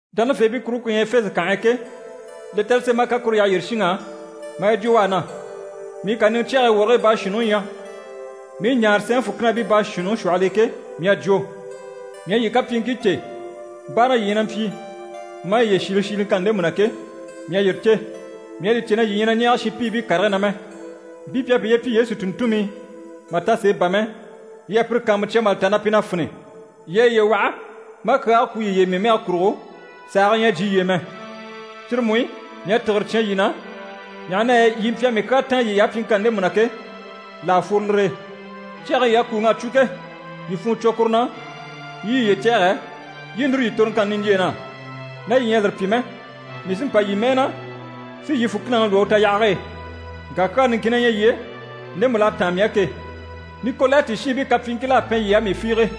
Dánafeebii kuruŋke ku ɲyɛ Efese kànhe e ke, lɛtɛrɛ sém'a kan kuru yyaha yyére shinŋ'á, maa yi jwo u á na: “Mii kàniŋɛ cyɛge e wɔrigii baashuunniŋi ɲyɛ, mii i ɲaare sɛɛnŋi fùkinabii baashuunniŋi shwɔhɔl'e ke, mii à jwo: mii à yii kapyiiŋkii cè, báaraŋi yii ɲyɛ na mpyi maa yiye shiile shiiliŋkanni ndemu na ke, mii à yire cè. Mii à li cè na yii ɲyɛ na ɲɛɛge shinpiibii karigii na mɛ. Mpii pi à piye pyi Yesu tùnntunmii mà ta sèe bà mɛ, yii à pire kàanmucya mà li ta na pi na fini. Yii à yiye waha, maa kyaage kwú yiye e mii mɛge kurugo, sàage ɲyɛ a jyè yii e mɛ. Cyire mú i, mii à tìgire cyán yii na, ɲaha na yɛ yii mpyi a mii kyaa táan yiy'á pyiŋkanni ndemu na ke, là a fworo lire e. Cyage yii à kùuŋ'a cwo ke, yii funŋɔ cwo kuru na, yii i yiye cɛ̂ɛgɛ, yii i núru yii toroŋkanni niɲjyeen'á. Ná yii ɲyɛ a lire pyi mɛ, mii sí n‑pa yii mɛɛ na, si yii fùkinaŋi lwɔ́ u tayahage e. Ŋka kyaa niŋkin na ɲyɛ yii e, ndemu l'à táan mii á ke. Nikolayiti shiinbii kapyiiŋkil'à pɛn yii á, mii fiige.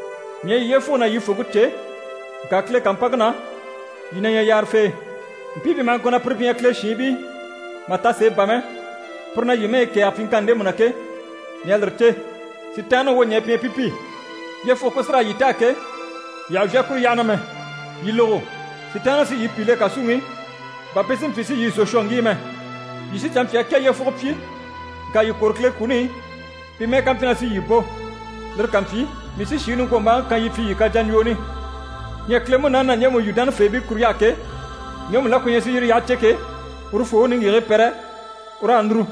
mii à yii yyefuge ná yii fòŋke cè, ŋka Kile kàmpanŋke na, yii na ɲyɛ yaarafee. Mpii pi maha ŋko na pire pi ɲyɛ Kile shiinbii, mà ta sèe bà mɛ, pire na yii mɛyi kɛ̀ɛge pyiŋkanni ndemu na ke, mii à lire cè. Sitaanniŋi wwoɲɛɛ pi ɲyɛ pi pi. Yyefuge ku sí raa yii taa ke, yii àha vyá kuru yyaha na mɛ. Yii lógo, Sitaanniŋi sí yii pìi le kàsuŋi i, bà pi si mpyi si yii zò shwɔ ŋgíi mɛ. Yii sí canmpyaa kɛ yyefugo pyi, ŋka yii kwôro Kile kuni i, pi mɛ́ɛ ká mpyi na sí yii bò. Lire ká mpyi, mii sí shìŋi niŋkwombaaŋi kan yii pyi yii kajaɲjwooni. Ɲyɛ Kile Munaani na ɲjemu yu dánafeebii kuruɲy'á ke, ŋgemu la ku ɲyɛ si yire yyaha cè ke, urufoo u niŋgyigigii pɛrɛ, u raa núru.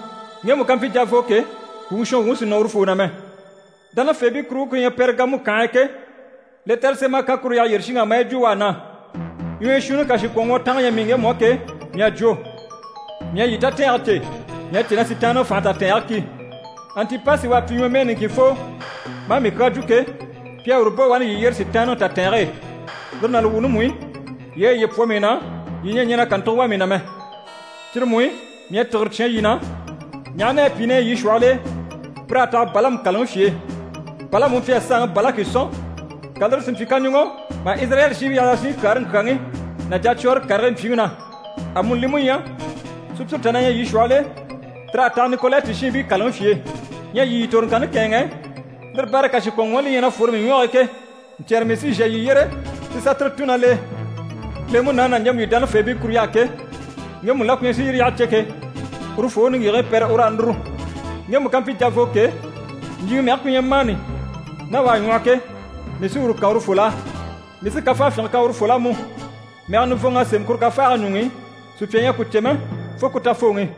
Ŋgemu ká mpyi javoo ke, kwùŋi shɔnwuŋi sì nɔ urufoo na mɛ.” Dánafeebii kuruŋke ku ɲyɛ Pɛrigamu kànhe e ke, lɛtɛrɛ sém'a kan kuru yyaha yyére shinŋ'á, maa yi jwo u á na: “Ɲwɔyɔ shuunni kàshikwɔnŋwɔtange ɲyɛ mii ŋgemu á ke, mii à jwo: mii à yii tatɛɛnge cè. Mii à cè na Sitaanniŋi fànhe tatɛɛnge ki. Antipasi u à pyi ɲwɔmɛɛ niŋkinfoo maa mii kyaa jwo ke, pi à uru bò wani yii yyére Sitaanniŋi tatɛɛnge e. Lire ná li wuuni mú i, yii à yiye pwɔ mii na, yii ɲyɛ a ɲɛn'a kàntugo wà mii na mɛ. Cyire mú i, mii à tìgire cyán yii na, ɲaha na yɛ pìi na ɲyɛ yii shwɔhɔl'e, pir'à taha Balamu kàlaŋi fye e. Balamu u mpyi a saanŋi Balaki sɔ̀n, ka lire si mpyi kaɲuŋɔ mà Izirayɛli shiinbii yaha yasunɲyi kyaare ŋkyaŋi ná jacwɔɔre karigii mpyiŋi na. Amuni li mú ɲyɛ, sùpyire tà na ɲyɛ yii shwɔhɔl'e, tir'à taha Nikolayiti shiinbii kàlaŋi fye e. Ɲyɛ yii yii toroŋkanni kɛ̂ɛnŋɛ, lire baare e kàshikwɔnŋwɔɔni li ɲyɛ na fwore mii ɲwɔge e ke, ɲcyɛ̀rɛ mii sí n‑shà yii yyére si sà tire tùn ná l'e. Kile Munaani na ɲjemu yu dánafeebii kuruɲy'á ke, ŋgemu la ku ɲyɛ si yire yyaha cè ke, urufoo u niŋgyigigii pɛrɛ, u raa núru. Ŋgemu ká mpyi javoo ke, ɲjyìŋi mɛge ku ɲyɛ mani ná u à ŋwɔhɔ ke, mii sí uru kan urufol'á. Mii sí kafafyinge kan urufol'á mú. Mɛgɛ nivɔnŋ'à sémɛ kuru kafaage ɲuŋ'i, sùpya ɲyɛ a ku cè mɛ, fo ku tafooŋi.”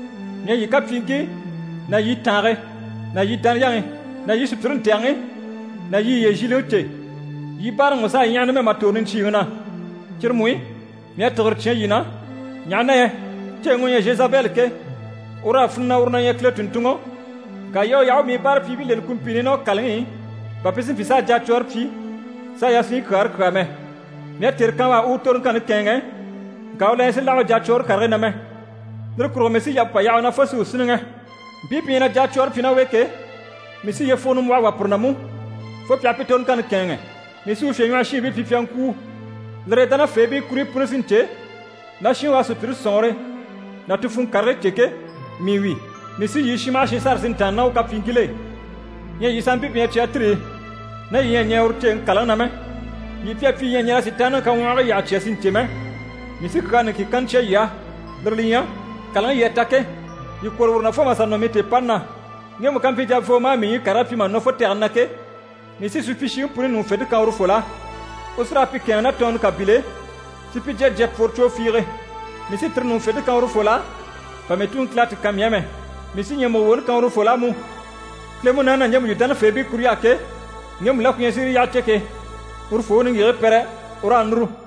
‘Mii à yii kapyiiŋkii ná yii tàange ná yii dániyaŋi ná yii sùpyire ntɛ̀gɛŋi ná yii yiye zhiiliŋi cè. Yii báaraŋi mú s'à ɲyaha numɛ mà tòro niɲcyiiŋi na. Cyire mú i, mii à tìgire cyán yii na, ɲaha na yɛ ceeŋi u ɲyɛ Zhezabɛli ke, ur'à finɛ na uru na ɲyɛ Kile tùnntunŋɔ, ŋka yii à u yaha u u mii báarapyiibii leni kumpiini i ná u kàlaŋi i, bà pi si mpyi s'a jacwɔɔre pyi, s'a yasunɲyi kyaare kyàa mɛ. Mii à tère kan u á u u toroŋkanni kɛ̂ɛnŋɛ, ŋka u la ɲyɛ sì láha u jacwɔɔre karigii na mɛ. Lire kurugo mii sí yampe pà yaha u na fo si u sínniŋɛ. Mpii pi ɲyɛ na jacwɔɔre pyi ná u e ke, mii sí yyefugo nimbwɔhɔ wà pire na mú, fo pi aha pi toroŋkanni kɛ̂ɛnŋɛ. Mii sí u fyèɲwɔhɔshiinbii pyi pi a ŋkwûu. Lire e, dánafeebii kuruɲyi puni sí n‑cè na shinŋi u à sùpyire sɔ̀nŋɔre ná ti funŋɔ karigii cè ke, mii wi. Mii sí yii shin maha shin sâra si ntàanna ná u kapyiiŋkil'e. Ɲyɛ yii sanmpii pi ɲyɛ Cyatiri i, ná yii ɲyɛ a ɲɛɛ uru ceeŋi kàlaŋi na mɛ, yii pi à pyi yii ɲyɛ a ɲɛn'a Sitaanniŋi kaŋwɔhigii yyaha cya si ɲcè mɛ, mii sí kyaa niŋkin kanna cya yii á, lire li ɲyɛ: kàlaŋi yii à ta ke, yii kwôro uru na fo mà sà nɔ mii tèepani na. Ŋgemu ká mpyi javoo maa mii ɲyii karigii pyi mà nɔ fo tɛgɛni na ke, mii sí supyishiŋi puni ɲùŋufente kan urufol'á. U sí raa pi kɛ̂ɛnŋi ná tɔɔnnɔ kàbil'e, si pi jya jya pworo cwoo fiige. Mii sí tire ɲùŋufente kan urufol'á, bà mii Tuŋi Kile à ti kan mii á mɛ. Mii sí ɲyɛ̀mugo woni kan urufol'á mú.’ Kile Munaani na ɲjemu yu dánafeebii kuruɲy'á ke, ŋgemu la ku ɲyɛ si yire yyaha cè ke, urufoo u niŋgyigigii pɛrɛ, u raa núru.”